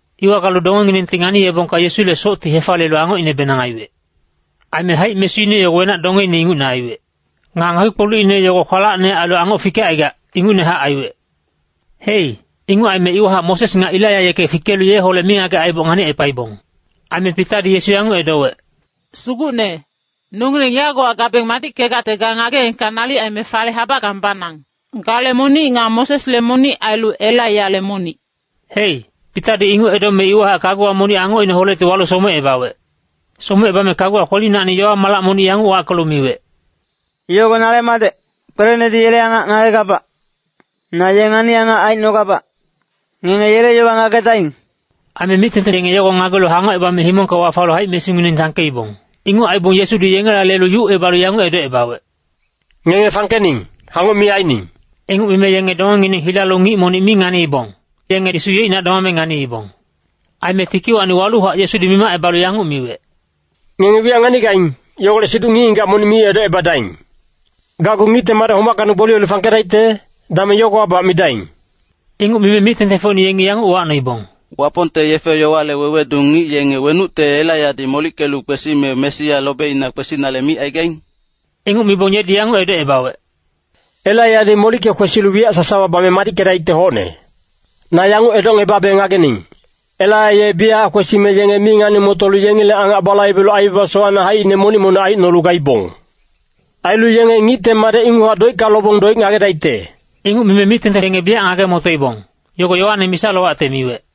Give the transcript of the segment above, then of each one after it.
Iwa galu dongenginengti nganiyebongka Yesule socti hefaliyelu angocinebenang aiwec. Aime haic-mesuine yogo wenac-dongeine ingucne aiwec. Nga ngakpi-kpolucine yogo kwalacne ailu angoc fikecaigac, ingucnehac aiwec. Hei, inguc aime iwahac Moses nga Elaiya yeke fikelu yeholec mingagec aiboc nganicepaibong. Aime Pitadi Yesu yanguc edowec, “Sugucne, nongileng yagowa gabeng madickegacte ga ngageengka nalic aime fale habackang banang. Gale monic nga Mosesle monic ailu Elaiyale monic.” Hei, Pitadi inguc edome iwahac kaguwa monic angocineholecti walu somecebawec. Somecebame kaguwa kwelinacni yowa-malac monic yanguc wackelu miwec, “Yogo nale Madec, kwelenedi yele angac ngagegabac. Na ye ngani-angac aicnogabac. Ngenge yele yowa ngagedaing!” Aime mic-tengteng yenge yogo ngagelu hangocebame himongka wafalu haic-mesungineng sangkeibong. Inguc aibong Yesudi yengela lelu yucebalu yanguc edocebawec, “Ngenge fangkening, hangoc mi aining.” Inguc mime yenge dongengineng hilalu ngic monic mi nganiibong, yenge Yesu yeicnac domame nganiibong. Aime tikiwacni waluhac Yesudi mimacebalu yanguc miwec, “Ngenge wiyac nganigaing, yogolec siduc ngic-ngigac monic mi edocebadaing. Gacgu Ngicte Madec homackacni gboliyelu fangkedaicte, dameng yogowabac midaing.” Inguc mime mic-tengtengfocine yengi yanguc uwacnoibong, “Wapongte yefe-yowale wewedu ngic yenge wenucte Elaiyadi molickelu kwesime Mesia lobeina kwesinale micaigaing?” Inguc mibong yedi yanguc edocebawec, “Elaiyadi molicke kwesilu wiyac sasawa bame madickedaicte hocne. Na yanguc edocngebabe ngagening, Elaiya ye biyachac kwesime yenge mi ngani-motolu yengileng angac balaibelu aibaba sowacne haicine monic-monic aicnolu gaibong. Ailu yenge Ngicte Madec inguchac doicka lobong doic ngagedaicte.” Inguc mime mic-tengteng yenge biyac ngage-motoibong, Yogo Yoane misa-lowacte miwec.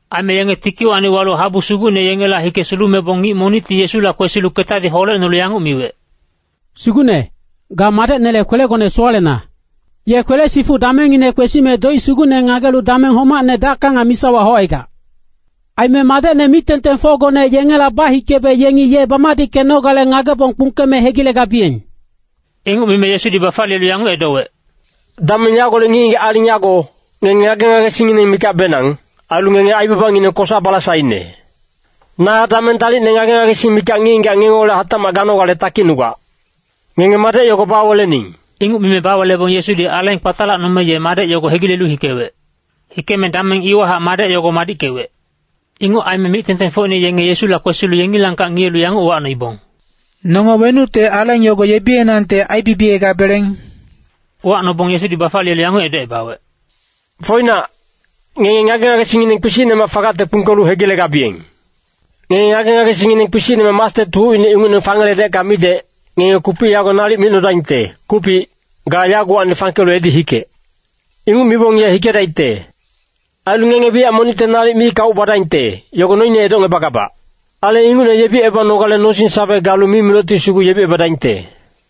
Aime yenge tikiwacni walu habu sugucne yengela hike sulumebong ngic monicti Yesula kwesilu ketadi holecnolu yanguc miwec, “Sugucne, ga madecnele kwelegone sowalena. Ye kwele-sifuc damengngine kwesime doic sugucne ngagelu dameng homacne dacka nga misawa haucaigac. Aime madecne mic-tengtengfocgone yengela bahikebe yengi ye bamadickenogale ngagebong kpungkeme hegilegabiyeng.” Inguc mime Yesudi bafaliyelu yanguc edowec, “Dameng yagolec ngic-ngigac aling yago, ngenge ngage-ngagesingngineng mikacbenang, ailu ngenge aibabangineng kosa-balasaine. Na dameng dalicne ngage-ngagesing mikac ngic-ngigac ngengeholec hatacmac ganogale takicnugac. Ngenge madec yogo bawelening.” Inguc mime bawelebong Yesudi aleng kpatalacnome ye madec yogo hegilelu hikewec. Hikeme dameng iwahac madec yogo madickewec. Inguc aime mic-tengtengfocine yenge Yesula kwesilu yengilangkac ngiyelu yanguc uwacnoibong, “Nonge wenucte aleng yogo yebiyenangte aibibiyegabeleng?” Uwacnobong Yesudi bafaliyelu yanguc edocebawec, “Foinac, ngenge ngage-ngagesingngineng kpisicnemac fagacte kpungkelu hegilegabiyeng. Ngenge ngage-ngagesingngineng kpisicne mastet hucine ingucne fangeledecka midec, ngenge kupic yago nalic micnodaingte, ‘Kupic, ga yagowacni fangkelu edi hikec.’ Inguc mibong ye hikedaicte. Ailu ngenge wiyac monicte nalic mi kauc badaingte, yogo noine edocngebagabac. [Aleng ingucne yebicebanogale nosing-sawe galu mimilocti sugu yebiyedaingte.]”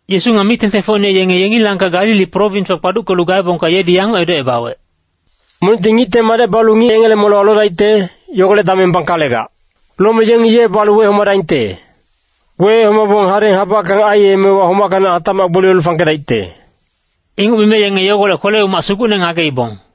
Yesu nga mic-tengtengfocine yenge yengilangkac Galili prowinswa kpaduckelu gaebongka yedi yanguc edocebawec, “Monicti Ngicte Madec balu ngic yengele molewa lodaicte, yogolec dameng bangkalegac. Lome yengi ye balu wehomadaingte. Wehomabong hadeng habackang aiyemewa homackacni hatacmac gboliyelu fangkedaicte.” Inguc mime yenge yogolec kwele-umac sugucne ngageibong.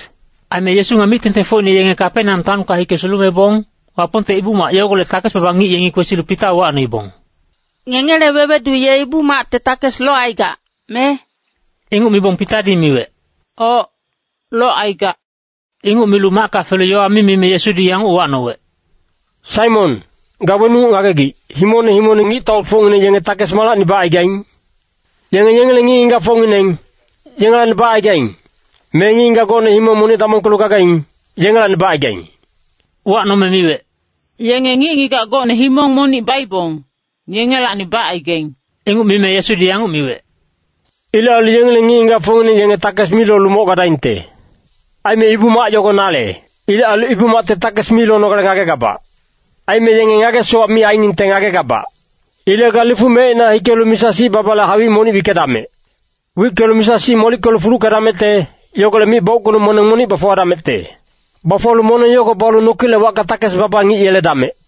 Aime Yesu nga mic-tengtengfocine yenge Kapeneam taonka hike sulumebong, Wapongte Ibu-mac yogolec takes-baba ngic yengi kwesilu Pita uwacnoibong, “Ngengele wewedu ye Ibu-macte takes locaigac, me?” Inguc mibong Pitadi miwec, “Oc, locaigac.” Inguc milu macka felu yowa mi mime Yesudi yanguc uwacnowec, “Saimon, ga wenuc ngagegic, himongne himongne ngictaufocngineng, yenge takes malacni bacaigaing? Yenge yengileng ngic-ngigacfocngineng, yengelacni bacaigaing, me ngic-ngigac gocne himong monic damongkelu gagaing, yengelacni bacaigaing?” Uwacnome miwec, “Yenge ngic-ngigac gocne himong monic baibong, yengelacni bacaigaing.” Inguc mime Yesudi yanguc miwec, “Ilec ailu yengileng ngic-ngigacfocngineng yenge takes mi lolu moc gadaingte. Aime Ibu-mac yogo nale. Ilec ailu Ibu-macte takes mi lonogale ngagegabac. Aime yenge ngage-sowac mi ainingte ngagegabac. Ilec ga lifuc mecina hikelu misa-sic babale hawic monic wickedamec. Wickelu misa-sic molickelu fuluckedamecte, yogolec mic bauckelu moneng monic bafuwadamecte. Bafuwalu moneng yogo balu nokilec wacka takes-baba ngic yeledamec.”